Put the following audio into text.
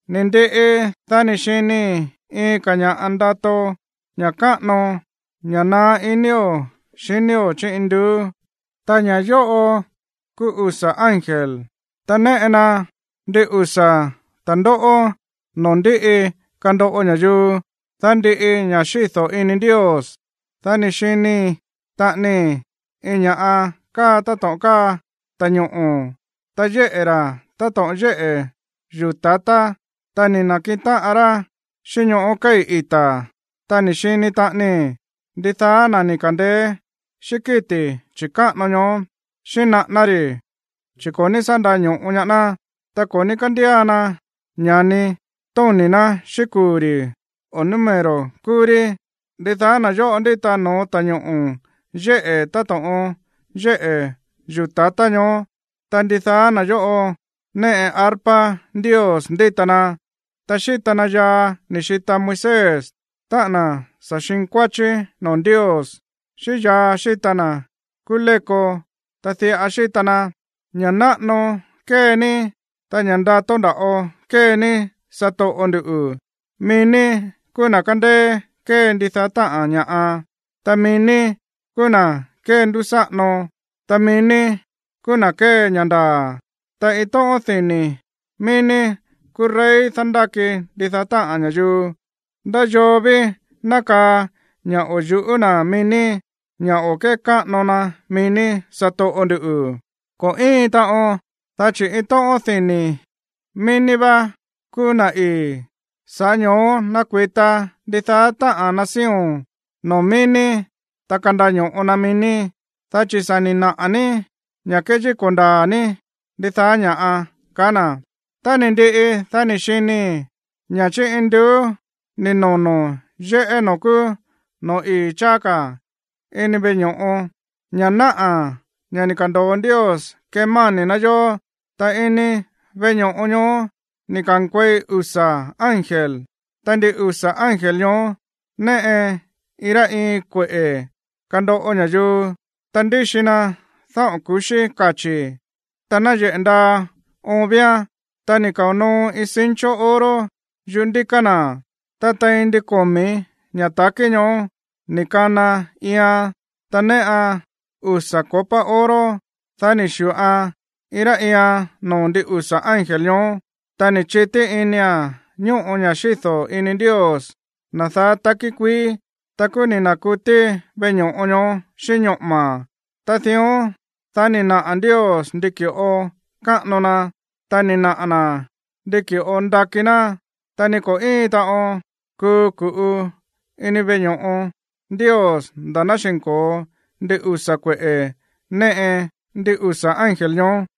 Ni̱ ndiꞌi, dá ni̱ xinii̱ iin ka̱ ña̱ꞌa ndato, ña̱ káꞌano, ña̱ naá inío̱ xinío̱ chí induú. Ta ña̱ yóꞌo kúú usa̱ ángel, ta néꞌe na ndin usa̱ ta̱ndóꞌó noo̱ ndíꞌi kandoꞌo ña̱yuu, dá ndiꞌi ña̱ xído̱ ini Ndios. Dá ni̱ xini taꞌanii iin ña̱ꞌa káa táto̱ꞌon káa ta̱ñoꞌo̱, ta yéꞌe̱ ra̱ táto̱ꞌon yéꞌe̱ yuu̱ ta̱tá, ta ni̱ na̱kiꞌin táꞌan rá xíꞌín ñoꞌó kéi̱ ita̱. Ta ni̱ xini taꞌanii ndidaá na̱ ni̱ ka̱ndeé xíꞌín kíti̱ chi̱káꞌano ñoó, xíꞌín naꞌáná ri̱, chi̱ ko̱ ní sá ndaño̱ꞌo ñaá ná, ta ko̱ ní kándía na ña̱ni tóni̱ ná xíꞌín kuu̱ ri̱ o número kuu̱ ri̱. Ndidaá na̱ yóꞌo ndíta no̱ó ta̱ñoꞌo̱ yéꞌe̱ táto̱ꞌon yéꞌe̱ yuu̱ ta̱tá ñoó, ta ndidaá na̱ yóꞌo néꞌe arpa Ndios ndíta na. Ta xíta na yaa ni̱ xita Moisés, táꞌa̱n na̱ sa̱ xinkuáchí noo̱ Ndios, xíꞌín yaa xíta na̱ kúú léko, ta diꞌa xíta na: Ña̱ náꞌano kée ní, ta ña̱ ndato nda̱ꞌo kée ní, satoꞌo ndu̱. Mií ní kúú na̱ kándéé kée ndidaá táꞌa̱n ña̱ꞌa. Ta mií ní kúú na̱ kéndúsáꞌano, ta mií ní kúú na̱ kée ña̱ ndaa̱. Ta iin tóꞌón dini̱ mií ní kúú rey dándáki ndidaá táꞌa̱n ña̱yuu. ¿Ndá yoo ví ná kaa ña̱ o̱ yu̱ꞌú na̱ mií ní, ña̱ o̱ kékáꞌano na mií ní, satoꞌo ndu̱? Ko̱ íin taꞌon, dá chi̱ iin tóꞌón dini̱ mií ní vá kúú na̱ ii̱. Sa̱ꞌá ño̱ó ná kuita ndidaá táꞌa̱n nación noo̱ mií ní, ta kandaño̱ꞌo na mií ní, dá chi̱ sa̱ ni̱ naꞌa̱ ní ña̱ kéyíko̱ ndaa̱ ní ndidaá ña̱. Tá ni̱ ndiꞌi, dá ni̱ xinii̱ ña̱ chí induú ni̱ nono̱ yéꞌé noo̱ kúú noo̱ ii̱ cháá ka̱ ini veꞌe ño̱ꞌo, ña̱ náꞌa̱ ña̱ ni̱ ka̱ndo̱o Ndios kemáni̱ ná yó. Ta ini veꞌe ño̱ꞌo ñoó ni̱ ka̱nkuei usa̱ ángel, ta ndin usa̱ ángel ñoó néꞌe iin rá iin kueꞌe̱ kandoꞌo ña̱yuu. Ta ndíxi na dáꞌo̱n ku̱xí kachi̱, ta náyeꞌe̱ ndaa oon víán, ta ni̱ kao̱ noo iin cincho oro yuꞌú ndíká na̱. Ta tein ndin komi̱ ña̱ ta̱kí ñoó ni kana iian, ta néꞌan usa̱ copa oro. Dá ni̱ xi̱ꞌoan iin rá iian noo̱ ndin usa̱ ángel ñoó, ta ni̱ chití inia̱n ñóꞌo ña̱ xído̱ ini Ndios, na̱ daá takí kuií. Ta kúú ni̱ na̱kutí veꞌe ño̱ꞌo ñoó xíꞌín ñoꞌo̱ma̱, ta dión, dá ni̱ naꞌa̱ Ndios ndi ki̱ꞌo káꞌano na, ta ni̱ naꞌa̱ na̱ ndi ki̱ꞌo nda̱kí na̱. Ta ni ko̱ íin taꞌon kuu ku̱ꞌu ini veꞌe ño̱ꞌo Ndios nda̱ ná xi̱nko̱o ndin usa̱ kueꞌe̱ néꞌe ndin usa̱ ángel ñoó.